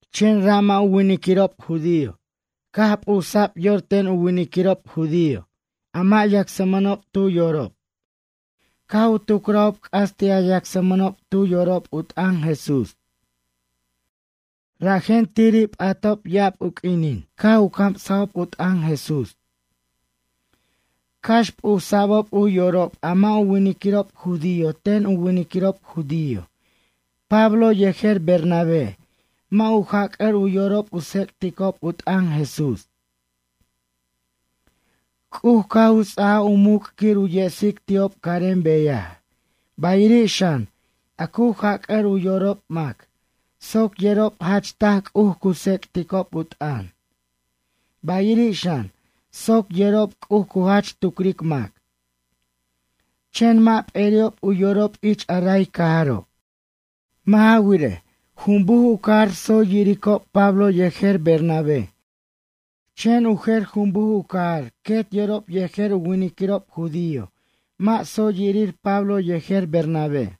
Chen ra' mʌ' u winiquirob judío caj p'usa'b yor ten u winiquirob judío a mʌ' yacsmʌnob tu yorob caj u tucrajob c'as ti' a yacsmʌnob tu yorob u t'ʌn Jesús. Rajen tiri' p'atob ya'ab u q'uinin caj u camsob u t'ʌn Jesús. Cax p'usa'bob u yorob a mʌ' u winiquirob judío ten u winiquirob judío, Pablo yejer Bernabé mʌ' u jac'ʌr u yorob u tsec'ticob u t'ʌn Jesús. C'uj caj u ts'ajaj u muc' quir u yesic ti'ob carem beyaj, bayiri' xan, a cu jac'ʌr u yorob mac, soc yerob jach taj C'uj cu tsec'ticob u t'ʌn, bayiri' xan, soc yerob C'uj cu jach tucric mac. Chen mʌ' p'eri'ob u yorob ich a ray cajaro'. Mʌ' ja wirej, junbuj u cajar tsoy yiricob Pablo yejer Bernabé, chen u jer junbuj u cajar quet yorob yejer u winiquirob judío, mʌ' tsoy yirir Pablo yejer Bernabé.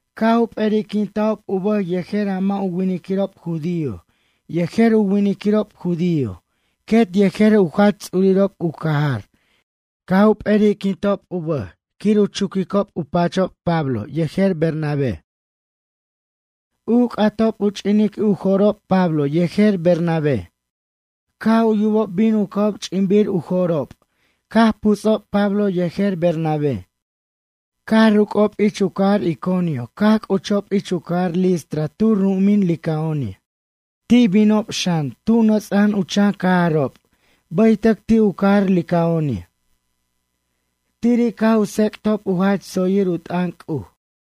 Caj u p'eriquintajob u bʌj yejer a mʌ' u winiquirob judío yejer u winiquirob judío quet yejer u jach ts'urirob u cajar, caj u p'eri'quintob u bʌj quir u chuquicob u pachob Pablo yejer Bernabé. U c'atob u ch'inic u jo'rob Pablo yejer Bernabé. Caj u yubob bin u ca'ob ch'inbir u jo'rob, caj puts'ob Pablo yejer Bernabé. Caj ruc'ob ich u cajar Iconio caj c'uchob ich u cajar Listra tu ru'umin Licaonia. Ti' binob xan, tu nʌts'a'an u chan cajarob bʌytʌc ti' u cajar Licaonia. Tiri' caj u tsec'tob u jach tsoyir u t'ʌn C'uj.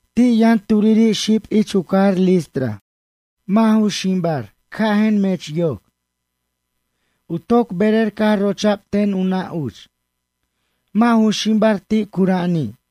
Ti' yʌn turiri' xib ich u cajar Listra, mʌ' ju ximbar, cajʌn mech yoc. U toc berer caj rocha'b ten u nʌ' uch. Mʌ' ju ximbar ti' cura'ani'.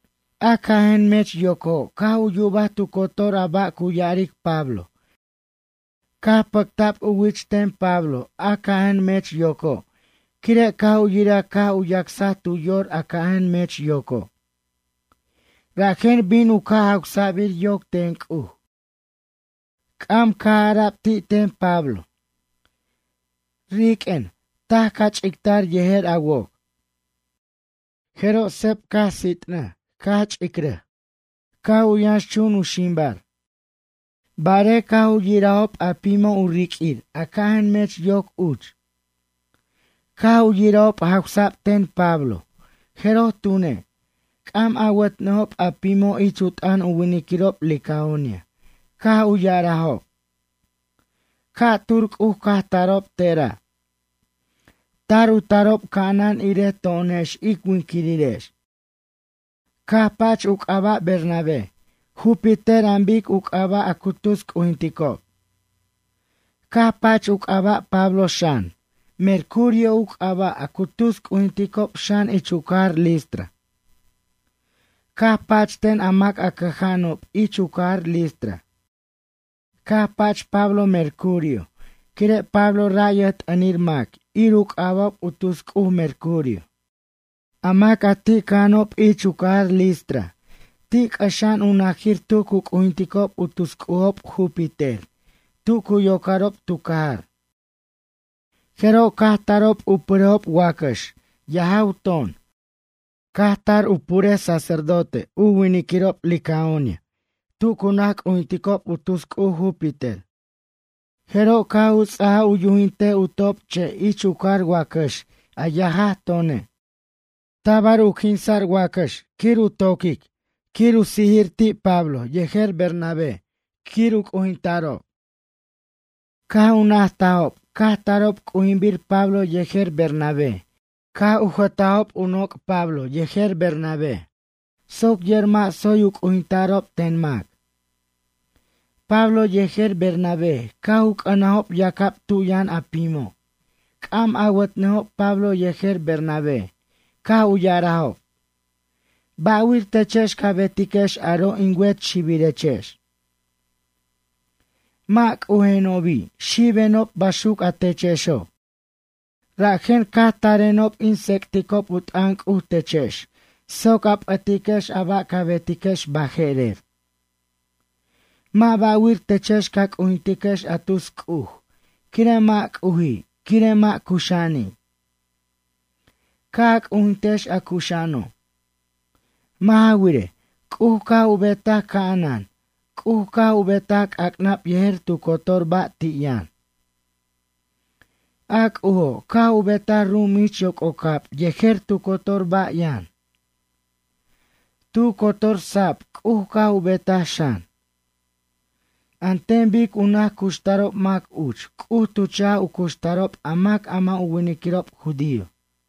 A cajʌn mech yoco', caj u yubaj tu cotor a ba' cu ya'aric Pablo, caj pʌcta'b u wich ten Pablo a cajʌn mech yoco', quire' caj u yiraj caj u yacsaj tu yor a cajʌn mech yoco'. Rajen bin u ca' jawsa'bir yoc ten C'uj. C'am caj ara'b ti' ten Pablo: ―Riq'uen, taj ca ch'ictar yejer a woc. Jeroj seb caj sit'nʌj caj ch'icrʌj, caj u yʌnxchun u ximbar. Barej caj u yirajob a pimo' u riq'uir a cajʌn mech yoc uch. Caj u yirajob jawsa'b ten Pablo, jeroj tune', c'am awʌtnʌjob a pimo' ich u t'ʌn u winiquirob licaonia caj u ya'arajob: ―Ca'tur c'uj caj tarob tera'. Tar u tarob ca'anan irej to'onex ic winquirirex. Caj pach u c'aba' Bernabé, Júpiter an bic u c'aba' a cu tus c'ujinticob. Caj pach u c'aba' Pablo xan, Mercurio u c'aba' a cu tus c'ujinticob xan ich u cajar Listra. Caj pach ten a mac a cʌja'anob ich u cajar Listra. Caj pach Pablo Mercurio quire' Pablo ra' yʌjt'ʌnir mac ir u c'aba'ob u tus cuj Mercurio. A mac a ti' cʌja'anob ich u cajar Listra ti' c'ʌxa'an u najir tu cu c'ujinticob u tus c'ujob Júpiter tu cu yocarob tu cajar. Jeroj caj tarob u purejob wacʌx, yajaj ton, caj tar u puraj sacerdote u winiquirob licaonia tu cu naj c'ujinticob u tus c'uj Júpiter. Jeroj caj u ts'ajaj u yujintej u top'che' ich u car wacʌx a yajaj tone'. Tabar u quinsa'r wacʌx quir u toquic quir u quinsa' ti' Pablo yejer Bernabé quir u c'ujinta'rob. Caj u najtajob caj tarob c'ujinbir Pablo yejer Bernabé, caj u jʌtajob u noc' Pablo yejer Bernabé soc yer mʌ' tsoy u c'ujinta'rob ten mac. Pablo yejer Bernabé, caj u c'ʌnajob yacab tu yʌn a pimo', c'am awatʌnʌjob Pablo yejer Bernabé caj u ya'arajob: ―Ba'wir techex ca betiquex aro' in wet xibirechex? Mʌ' c'ujenobi', xibenob baxuc a techexo'. Rajen caj tarenob in tsec'ticob u t'ʌn C'uj techex soc a p'ʌtiquex a ba' ca betiquex baje'rer. Mʌ' ba'wir techex ca c'ujintiquex a tus c'uj, quire' mʌ' c'uji' quire' mʌ' cuxa'ani'. Ca' a c'ujintex a cuxa'ano'. Mʌ' ja wirej, C'uj caj u betaj ca'anan, C'uj caj u betaj c'ac'nab yejer tu cotor ba' ti' yʌn. A C'ujo', caj u betaj ru'um ich yoc'ocab yejer tu cotor ba' yʌn. Tu cotor sab C'uj caj u betaj xan. An ten bic u naj cuxtarob mac uch C'uj tu cha'j u cuxtarob a mac a mʌ' u winiquirob judío.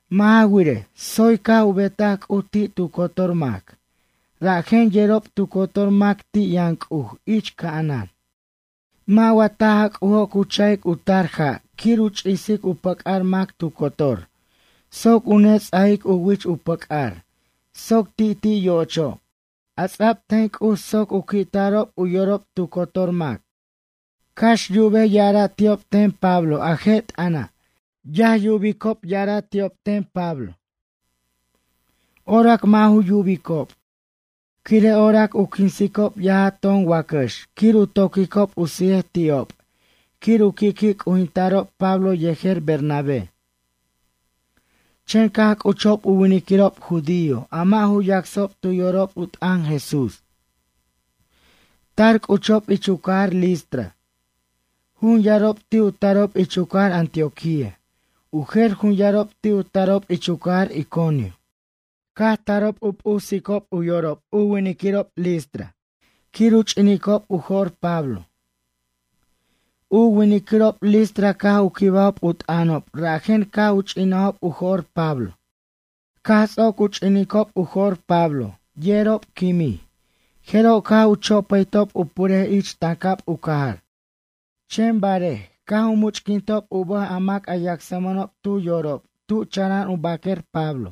Mʌ' ja wirej, tsoy caj u betaj C'uj ti' tu cotor mac, rajen yerob tu cotor mac ti' yʌn C'uj ich ca'anan. Mʌ' wa taj a C'ujo' cu cha'ic u tar ja' quir u ch'isic u pʌc'ar mac tu cotor, soc u ne ts'ajic u wich u pʌc'ar soc ti'ti' yo'ocho', a ts'a'b ten C'uj soc u qui'tarob u yorob tu cotor mac? Cax yubej ya'ara' ti'ob ten Pablo a je' t'ʌna', yaj yubob ya'ara' ti'ob ten Pablo. Orac mʌ' ju yubicob, quire' orac u quinsob yajaj ton wacʌx quir u toquicob u sijej ti'ob quir u qui'qui' c'ujinta'rob Pablo yejer Bernabé. Chen caj c'uchob u winiquirob judío a mʌ' ju yacsob tu yorob u t'ʌn Jesús. Tar c'uchob ich u cajar Listra. Jun yarob ti' u tarob ich u cajar Antioquía, u jer jun yarob ti' u tarob ich u cajar Iconio. Caj tarob u p'usicob u yorob u winiquirob listra quir u ch'ininob u jo'r Pablo. U winiquirob listra caj u quibajob u t'ʌnob rajen caj u ch'inajob u jo'r Pablo. Caj ts'oc u ch'ininob u jo'r Pablo, yerob quimij, jeroj caj u chopʌytob u purej ich tancab u cajar. Chen barej, caj u much'quintob u bʌj a mac a yacsmʌnob tu yorob tu chara'an u baquer Pablo,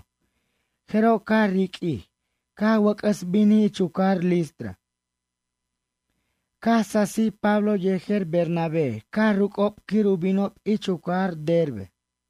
jeroj caj riq'uij, caj wʌc'ʌs binij ich u cajar Listra. Caj sasij Pablo yejer Bernabé caj ruc'ob quir u binob ich u cajar Derbe.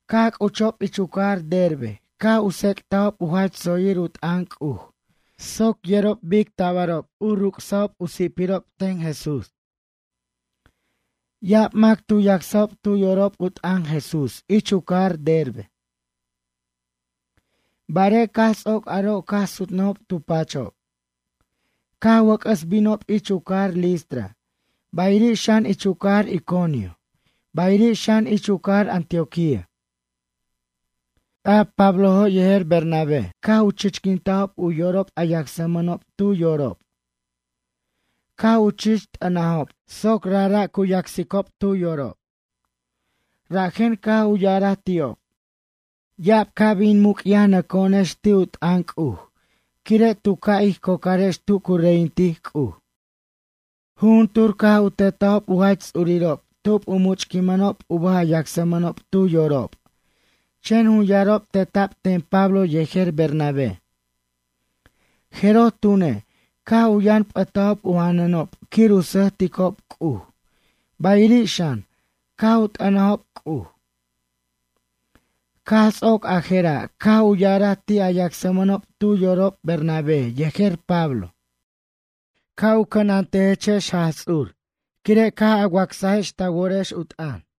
Caj c'uchob ich u cajar Derbe caj u tsec'tajob u jach tsoyir u t'ʌn C'uj soc yerob bic tabarob u ruc'sa'ob u si'pirob ten Jesús. Ya'ab mac tu yacsajob tu yorob u t'ʌn Jesús ich u cajar Derbe. Barej caj ts'oc aro' caj sutnʌjob tu pachob. Caj wʌc'ʌs binob ich u cajar Listra, bayiri' xan ich u cajar Iconio, bayiri' xan ich u cajar Antioquía. A Pablojo' yejer Bernabé caj u chichquintajob u yorob a yacsmʌnob tu yorob. Caj u chich t'ʌnajob soc rajra' cu yacsicob tu yorob. Rajen caj u ya'araj ti'ob: ―Ya'ab ca' bin muc'yajnʌco'onex ti' u t'ʌn C'uj quire' tu ca' ij cocarex tu cu reyintic C'uj. Jujuntur caj u tetajob u jach ts'urirob tub u muchquinmʌnob u bʌj a yacsmʌnob tu yorob, chen jun yarob teta'b ten Pablo yejer Bernabé. Jeroj tune', caj u yʌn p'ʌtajob u janʌnob quir u sʌjticob C'uj, bayiri' xan, caj u t'ʌnajob C'uj. Caj ts'oc a jera', caj u ya'araj ti' a yacsmʌnob tu yorob Bernabé yejer Pablo: ―Ca' u cʌnantejtechex Jaj Ts'ur quire' caj a wacsajex ta worex u t'ʌn.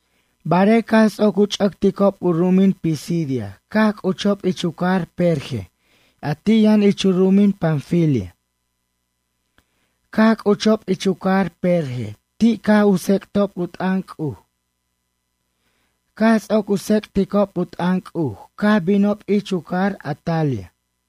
Barej caj ts'oc u ch'ʌcticob u ru'umin Pisidia caj c'uchob ich u cajar Perge a ti' yʌn ich u ru'umin Panfilia. Caj c'uchob ich u cajar Perge ti' caj u tsec'tob u t'ʌn C'uj. Caj ts'oc u tsec'ticob u t'ʌn C'uj caj binob ich u cajar Atalia.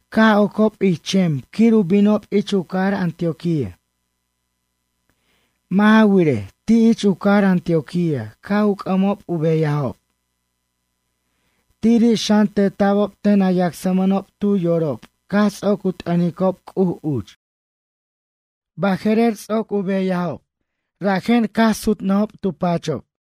Caj ocob ich chem quir u bin ich u cajar Antioquía. Mʌ' ja wirej, ti' ich u cajar Antioquía caj u c'ʌmob u beyajob. Tiri' xan teta'bob ten a yacsmʌnob tu yorob caj ts'oc u t'ʌnicob C'uj uch. Baje'rer, ts'oc u beyajob rajen caj u sutob tu pachob.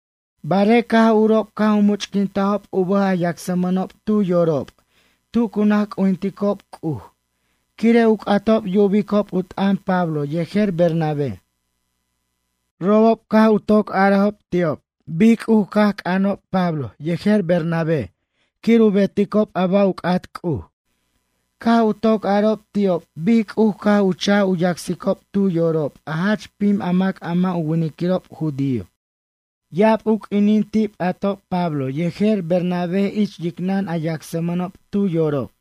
Barej caj urob caj u much'quintajob u bʌj a yacsmʌnob tu yorob tu cu naj c'ujinticob C'uj quire' u c'atob yubicob u t'ʌn Pablo yejer Bernabé. Robob caj u toc arajob ti'ob bic C'uj caj c'anob Pablo yejer Bernabé quir u beticob a ba' u c'at C'uj. Caj u toc arob ti'ob bic C'uj caj u cha'j u yacsicob tu yorob a jach pim mac a mʌ' u winiquirob judío. Ya'ab u q'uinin ti' p'atob Pablo yejer Bernabé ich yicnʌn a yacsmʌnob tu yorob.